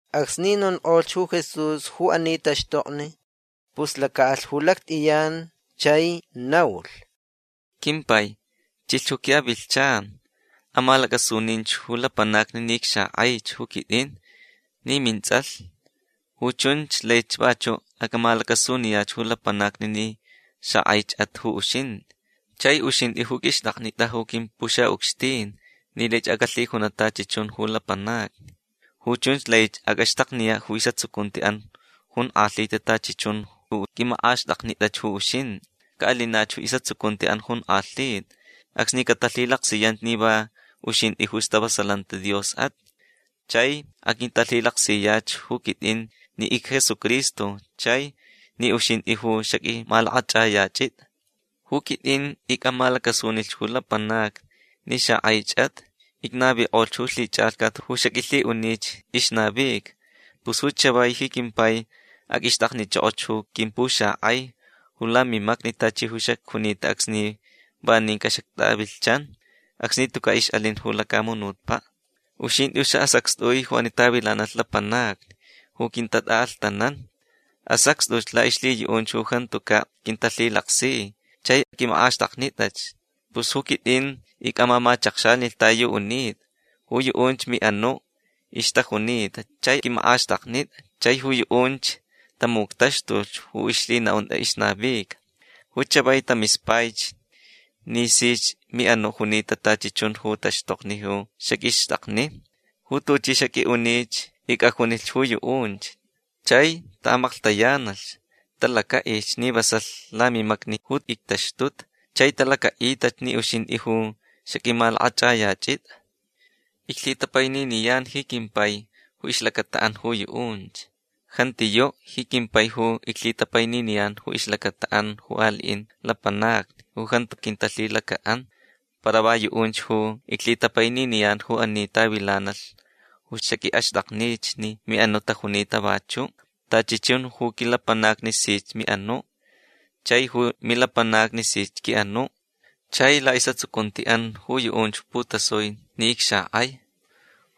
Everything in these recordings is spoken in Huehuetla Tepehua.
Acsni nonkʼolhch ju Jesús ju ani taxtokni pus lacaʼalh ju lactʼiyan chai naulh: ―Quimpai chilhch ju quiʼavilhchan. Amalacʼasuninch ju lapanacni ni icxakʼaich ju quitʼin ni mintsʼalh. Ju chunch laich vachuʼ acʼamalacasuniyach ju lapanacni ni xakʼaichʼat ju uxintʼi. Chai uxintʼi ju qʼuixtʼaknitʼa ju quimpuxaʼucxtin ni laich acʼalhijunaʼ tachi chun ju lapanacni. Ju chunch lai acʼaxtakniyaʼ ju isʼatsucuntiʼan jonkʼalhita tachi chun ju qʼuimakʼaxtʼaknitʼach ju uxintʼi. Caʼalinach ju isʼatsucuntiʼan jonkʼalhita acsni catalhilaksiyanch ni va uxintʼi ju istavasalanti Diosʼat. Chai aquintalhilaksiyach ju quitʼin ni icJesucristo chai ni uxintʼi ju xaqʼuimalakʼachʼayachitʼa. Ju quitʼin icʼamalacasunilhch ju lapanacni ni xakʼaichʼat. Icnavikʼolhch ju lhichʼalhcat ju xaqʼuilhiʼunich ixnavica. Pus ju chavai ji quimpai aqʼuixtʼaknichʼokʼoch ju quimpuxakʼai ju lamimacni tachi ju xacjunita acsni vanincaʼ xactʼavilhchan. Acsni tucaʼ ixʼalin ju lacamunutpaʼ. Uxintʼi ju saʼasacxtʼui ju ani tavilanalh lapanacni ju quintatʼaʼalhtanan. Asacxtʼuch laʼixlhiyuʼunch ju jantucaʼ quintalhilaksi chai qʼuiʼamakʼaxtʼaknitʼach. Pus ju quitʼin icʼamamachakxanilh ta yu unitʼa. Ju yuʼunch miʼanuʼ ixtajunita chai qʼuiʼamakʼaxtʼaknitʼa. Chai ju yuʼunch tamuctaxtulh ju ixlhinaʼuntʼa ixnavica. Ju chavai tamispaich ni sich miʼanuʼ junita tachi chun ju taxtokni ju xaqʼuixtʼakni. Ju tuchʼi xaqʼuiʼunich icʼajunilh ju yuʼunch. Chai taʼamaklhtayanalh. Talacaʼilhch ni vasalh lamimacni ju ictaxtuta. Chai talacaʼitach ni uxintʼi ju xaqʼuimalakʼachʼayachitʼa. Iclhitapaininiyan ji quimpai ju ixlacataʼan ju yuʼunch. Jantiyuʼ ji quimpai ju iclhitapaininiyan ju ixlacataʼan ju aliʼin lapanacni ju jantu quintalhilacaʼan. Para va yuʼunch ju iclhitapaininiyan ju ani tavilanalh ju xaqʼuiʼaxtʼaknich ni miʼanuʼ tajunita vachuʼ. Tachi chun ju quilapanacni sich miʼanuʼ. Chai ju milapanacni sich quiʼanuʼ. Chai laʼisʼatsucuntiʼan ju yuʼunch putasui ni icxakʼai.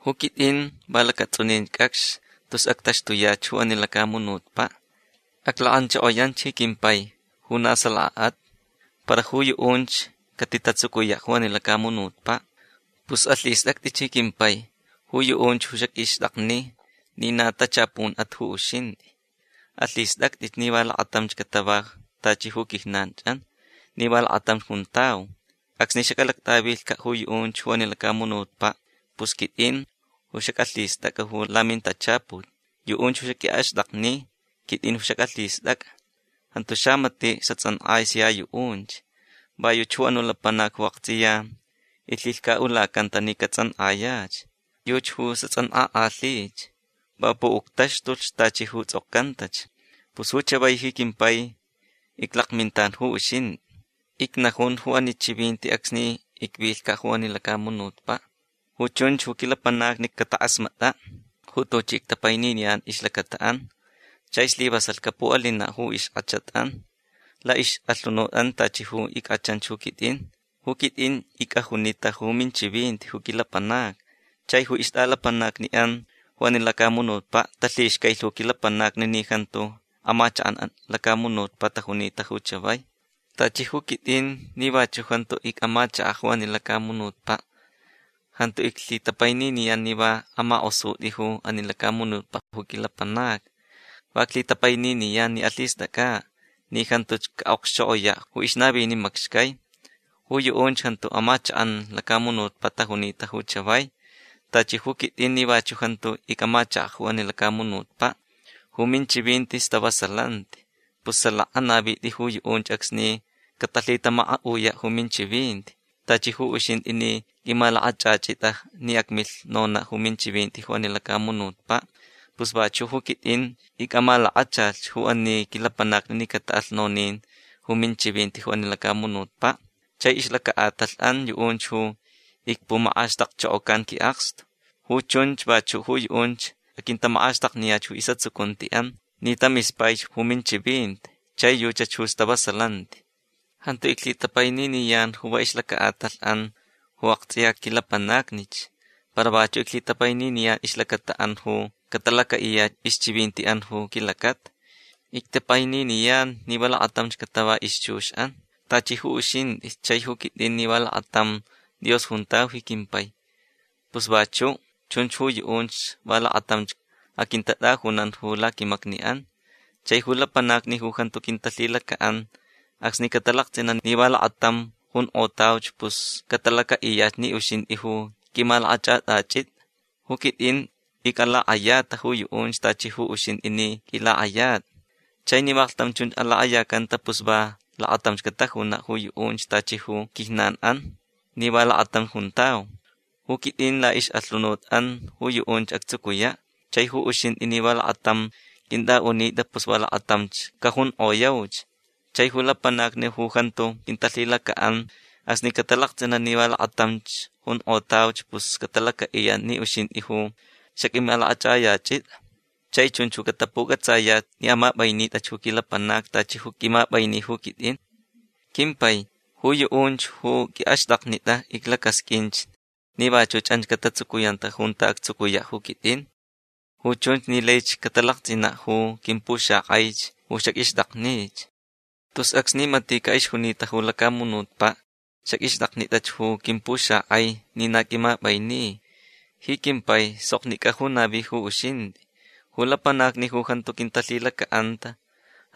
Ju quitʼin va lacatsʼunin cʼacx tus actaxtuyach ju ani lacamunutpaʼ. Aclakʼanchokoyan ji quimpai ju na salakaʼat. Para ju yuʼunch catitatsucuyaʼ ju ani lacamunutpaʼ. Pus alhistʼactʼich ji quimpai ju yuʼunch ju xaqʼuixtʼakni ni na tachapunʼat ju uxintʼi. Alhistʼactʼich ni va lakatamch catava tachi ju quijnanchʼan ni va lakatamch juntau. Acsni xacʼalactʼavilhcaʼ ju yuʼunch ju ani lacamunutpaʼ pus quitʼin ju xacʼalhistʼacʼa lamintachaput. Yuʼunch ju xaqʼuiʼaxtʼakni quitʼin ju xacʼalhistʼacʼa. Jantu xamatiʼ xatsʼankʼai sia yuʼunch. Va yuchi ju anuʼ lapanac ju aktsʼiya ixlhilhcaʼulacanta ni catsʼankʼayach. Yuchi ju xatsʼankʼakʼalhich. Va puʼuctaxtulh tachi ju tsʼokcantach. Pus ju chavai ji quimpai iclakmintan ju uxintʼi. Icnajun ju ani chivinti acsni icvilhcaʼ ju ani lacamunutpaʼ. Ju chunch ju quilapanacni catakʼasmatʼaʼ ju tuchi ictapaininiyan ju ixlacataʼan chai slivasalh capuʼalinaʼ ju ixkʼachatʼan laʼixʼalhunutʼan tachi ju ickʼachanch ju quitʼin. Ju quitʼin icʼajunita ju minchivinti ju quilapanacni. Chai ju ixtʼalapanacniʼan ju ani lacamunutpaʼ talhixcailh ju quilapanacni ni jantu amachakʼan lacamunutpaʼ tajunita ju chavai. Tachi ju quitʼin ni vachuʼ jantu icʼamachakaʼ ju ani lacamunutpaʼ. Jantu iclhitapaininiyan ni va amakʼosutʼi ju ani lacamunutpaʼ ju quilapanacni. Va iclhitapaininiyan ni alhistʼacʼaʼ ni jantuch caʼokxchokʼoyaʼ ju ixnavini macxcai. Ju yuʼunch jantu amachakʼan lacamunutpaʼ tajunita ju chavai. Tachi ju quitʼin ni vachuʼ jantu icʼamachakaʼ ju ani lacamunutpaʼ. Ju minchivinti stavasalanti. Pus salaka anavitʼi ju yuʼunch acsni catalhitamakaʼuyaʼ ju minchivinti. Tachi ju uxintʼi ni qʼuimalakʼachʼachitʼa ni acmilh nonaʼ ju minchivinti ju ani lacamunutpaʼ pus vachuʼ ju quitʼin icʼamalakachalh ju ani quilapanacni ni cataʼalh nonin ju minchivinti ju ani lacamunutpaʼ. Chai ixlacaʼatalhʼan yuʼunch ju icpumakʼaxtakchokocan quiʼakstu. Ju chunch vachuch ju yuʼunch aquintamakʼaxtakniyach ju isʼatsucuntiʼan ni tamispai ju minchivinti. Chai yuchach ju stavasalanti. Jantu iclhitapaininiyan ju va ixlacaʼatalhʼan ju aktsʼiya quilapanacnich. Para vachuʼ iclhitapaininiyan ixlacataʼan ju catalacaʼiyach ixchivintiʼan ju quilacata. Ictapaininiyan ni va lakatamch catava ixchuxʼan. Tachi ju uxintʼi chai ju quitʼin ni va lakatam Dios juntau ji quimpai. Pus vachuʼ chunch ju yuʼunch va lakatamch aquintatʼajunan ju laquimacniʼan. Chai ju lapanacni ju jantu quintalhilacaʼan acsni catalaktsʼinaʼ ni va lakatam junkʼotauch pus catalacaʼiyach ni uxintʼich ju qʼuimalakʼachʼatʼachitʼa. Ju quitʼin icʼalakʼayata ju yuʼunch tachi ju uxintʼi ni qʼuilakʼayatʼa. Chai ni vaklhtam chun alakʼayacanta pus va lakatamch catajunaʼ ju yuʼunch tachi ju quijnanʼan ni va lakatamch juntau. Ju quitʼin laʼixʼalhunutʼan ju yuʼunch actsucuyaʼ. Chai ju uxintʼi ni va lakatam qʼuintʼaʼunitʼa pus va lakatamch cajunkʼoyauch. Chai ju lapanacni ju jantu quintalhilacaʼan acsni catalaktsʼinaʼ ni va lakatamch jonkʼotauch pus catalacaʼiyaʼ ni uxintʼi ju xaqʼuimalakʼachʼayachitʼa. Chai chunch ju catapucʼatsayach ni amapʼainitʼach ju quilapanacni tachi ju qʼuimapʼaini ju quitʼin. Quimpai ju yuʼunch ju quiʼaxtʼaknitʼa iclacasqʼuinch ni vachuch anch catatsucuyanta junta actsucuyaʼ ju quitʼin. Ju chunch ni laich catalaktsʼinaʼ ju quimpuxakʼaich ju xaqʼuixtʼaknich. Tus acsni maticaʼ ixjunita ju lacamunutpaʼ xaqʼuixtʼaknitʼach ju quimpuxakʼai ni na qʼuimapʼaini. Ji quimpai soknicʼa ju navi ju uxintʼi. Ju lapanacni ju jantu quintalhilacaʼanta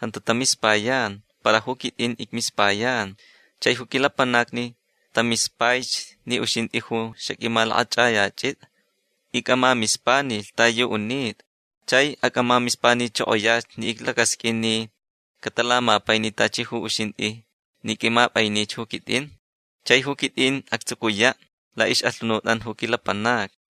jantu tamispayan. Para ju quitʼin icmispayan. Chai ju quilapanacni tamispaich ni uxintʼi ju xaqʼuimalakʼachʼayachitʼa. Icʼamamispanilhch ta yu unitʼa. Chai acʼamamispanichokoyach ni iclacasqʼuin ni catalamapaini tachi ju uxintʼi ni qʼuimapʼainich ju quitʼin. Chai ju quitʼin actsucuyach laʼixʼalhunutʼan ju quilapanacni.